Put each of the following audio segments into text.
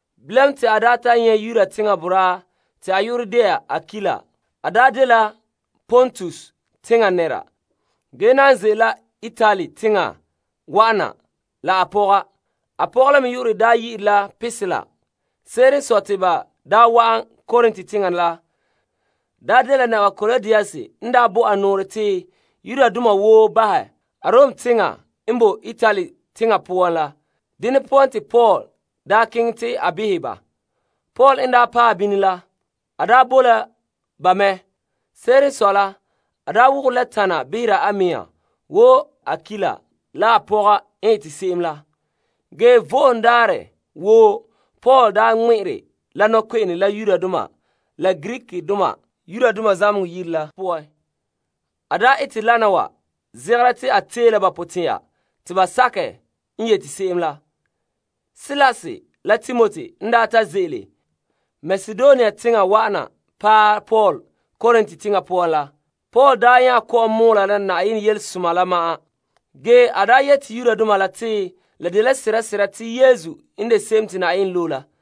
Bilam te a nyɛ' Yuda teŋa boraa te a yu'urɛ de'a Akuila. A dela Pontus teŋa nɛra ge nan ze'ele la Itali teŋa wa'an na la a pɔga. A pɔga la me yu'urɛ dela Prisila. Se'ere n sɔe te ba daa wa'an Korint teŋa la, dela Naba Klaudius n bo a nɔɔrɛ te Yudoma woo bahɛ Arom teŋa poan la. Dene poan te Paul keŋɛ te a behɛ ba. Paul n daa paɛ bini la, a boe la ba mɛ. Se'ere n sɔe la a daa wogore la tana behera a mea wo Akuila la a pɔga n ete se'em la. Ge Vo'ohogo Daarɛ woo Paul daa ŋmɛ'ɛre la nɔkpe'ene la Yudoma la Greekdoma zamehegɔ yire la poan. A ete lana wa zegera te a tee la ba potɛn'ɛra te ba sakɛ n yete se'em la. Silas la Timoti n daa ta ze'ele Makedonia teŋa wa'an na paɛ Paul Korint teŋa poan la, Paul nya kɔ'ɔn mɔɔla la Yenɛ yelesoma la ma'an. Ge a yete Yudoma la te la dela sesera te Yesu n de Se'em Te Yenɛ Loe La.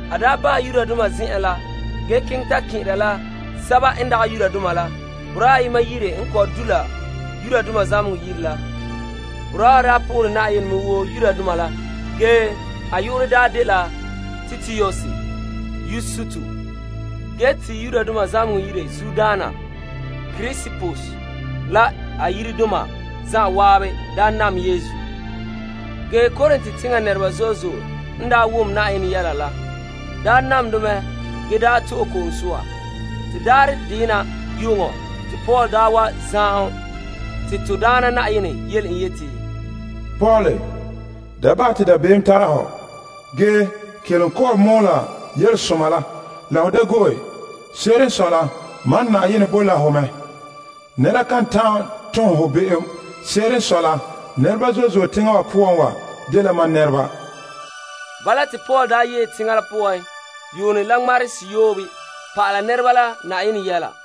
A nya bahɛ zamehegɔ yire ge keŋɛ ta kɛn'ɛra boraa ayema yire n kɔ'ɔn du' la zamehegɔ yire la. Boraa wa po'ohere Yenɛ mɛ wo Yudoma la a yu'urɛ dela Titius Yustus. Ge te zamehegɔ yire zuodaana Krispus la a yiredoma zan'an nam Yesu. Ge Korint teŋa nɛreba zo'e zo'e n wom Na'ayenɛ yɛla la daa nam de mɛ ge to'e ko'om soa. Te daarɛ deyema yu'uŋɔ te Paul wa liligere te to Daana Na'ayenɛ yele en yeti, Paul, da bahɛ te dabeem tara hɔ. Ge kelom kɔ'ɔn mɔɔla Yelesoma la la ho da go'e. Se'ere n sɔe la mam Na'ayenɛ boe la ho mɛ. Nɛra kan ta'an tom ho be'em. Se'ere n sɔe la nɛreba zo'e zo'e teŋa wa poan wa dela mam nɛreba. Bala te Paul yee teŋa la poan yuunɛ la ŋmarehe seyoobe pa'ala nɛreba la Yenɛ yɛla.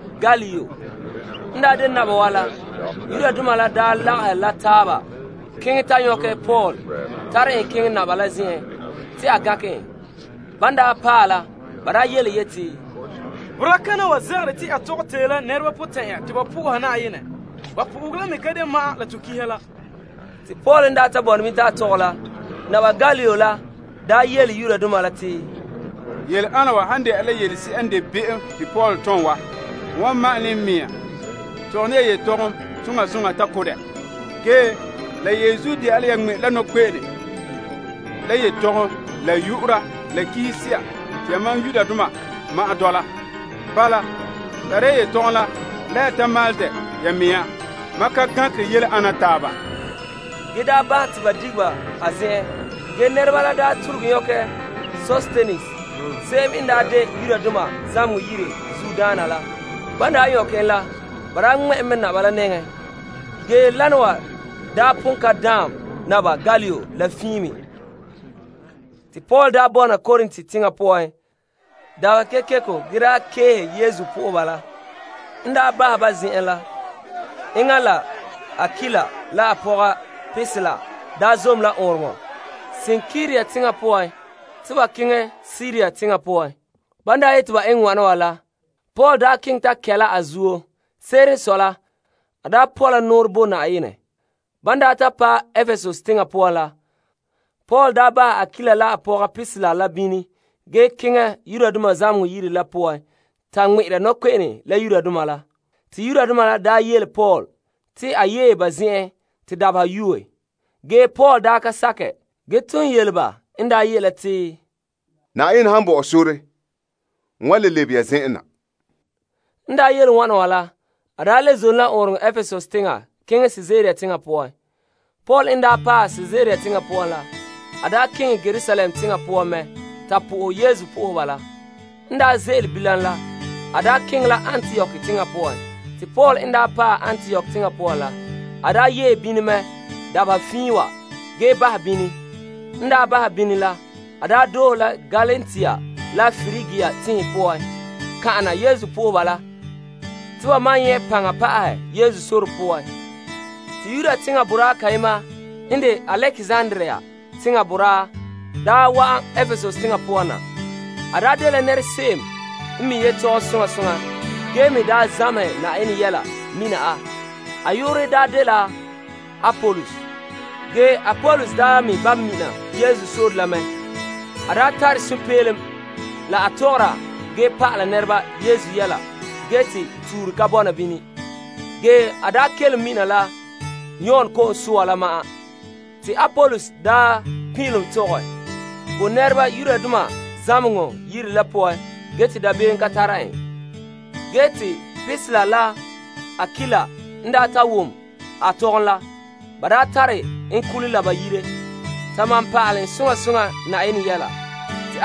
Gallio n daa behera Akaia bo naba la, Yudoma la lagahɛ la taaba keŋɛ ta nyɔkɛ Paul tare en keŋɛ naba la zen'en te a gankɛ en. Ban paɛ la, ba yeti, Boraa kana wa zegere te a tɔgɛ tee la nɛreba potɛn'ɛra te ba po'oha Yenɛ. Ba po'ohegɔ la me dagɛ ma'an la to pa'alegɔ la. Te Paul n ta bɔna bini te a tɔgɛ la, Naba Gallio la yele Yudoma la te, Yɛla ana wa han dene la yelese'a n de be'em te Paul wa tone wa, n wan ma'ane n mea tɔgɛ ne ya yetɔgom soŋa soŋa ta ko' dɛ. Ge la yenzuo de'a la ya ŋmɛ'ɛre la nɔkpe'ene la yetɔgom la yu'ura la pa'alegɔ se'a te yamam ma'an dɔla. Bala, tare ya yetɔgom la la ya ta maalɛ dɛ ya mea. Mam ka gankere yele ana taaba. Ge te a bahɛ te ba dige ba a zen'en. Ge nɛreba la tuluge nyɔkɛ Sostenes se'em n daa de zamehegɔ yire zuodaana la ŋmɛ' en mɛ naba la nɛŋa. Ge wana wa pon ka daan Naba Gallio la fiin me. Te Paul daa bɔna Korint teŋa poan dabeha kekeko nya keehe Yesu nɛreba la. Te enŋa la Akuila la a pɔga Prisila zom la ɔɔnrɔŋɔ kantɛ Kenkrea teŋa poan te ba keŋɛ Siria teŋa poan. Ban yete ba eŋɛ wana la, Paul keŋɛ ta kɛ la a zuo. Se'ere n sɔe la, a daa pɔ' la nɔɔrɛ bo Yenɛ. Ban paɛ Epesus teŋa poan la, Paul bahɛ Prisila la Akuila la bini ge keŋɛ zamehegɔ yire ta ŋmɛ'ɛra nɔkpe'ene la Yudoma la. Ban yele Paul te a yee ba zen'en te dabeha yuue, Paul ka sakɛ ge ton yele ba n ye' la te, Yenɛ han bɔ'ɔ sore, n wan le lebe ya zen'an na. En yele wana wa la, a le zom la ɔɔnrɔŋɔ kantɛ Epesus teŋa keŋɛ Kaesarea teŋa poan. En paɛ Kaesarea teŋa poan la, a daa keŋɛ Yerusalem teŋa poan mɛ ta po'ohɛ Yesu nɛreba la ge keŋɛ la Antiok teŋa poan. Paul n yee Antiok mɛ dabeha fiin wa, a bahɛ bini ge doohe la Galatia la Prigia teŋhe poan kan'ana Yesu dɔlɔba la te ba maan nyɛ' paŋa pa'ahɛ Yesu sore poan. Saŋkaŋa la Yudoma ayema n kɛn'ɛra Alekzandria teŋa daa wa'an Epesus teŋa poan na. A dela nɛrese'em n mi' yetɔgom soŋa soŋa ge me zamehɛ Yenɛ gɔŋɔ mina a. A yu'urɛ daa dela Apolos ge a me ba' mina to Daana sore la mɛ. A tare sunpeelom la a tɔgɔra ge pa'ala nɛreba Yesu yɛla ge te tuure ka bɔna bini ge a kelom mina la Yon ko'om soa la ma'an. Te Apolos daa pin'ilom tɔgɛ bo nɛreba zamehegɔ yire la poan ge te dabeem ka tare en. Prisila la Akuila n ta wom a tɔgom la, ba tare en kule la ba yire ta pa'alɛ en Yenɛ yɛla la pa'ahɛ.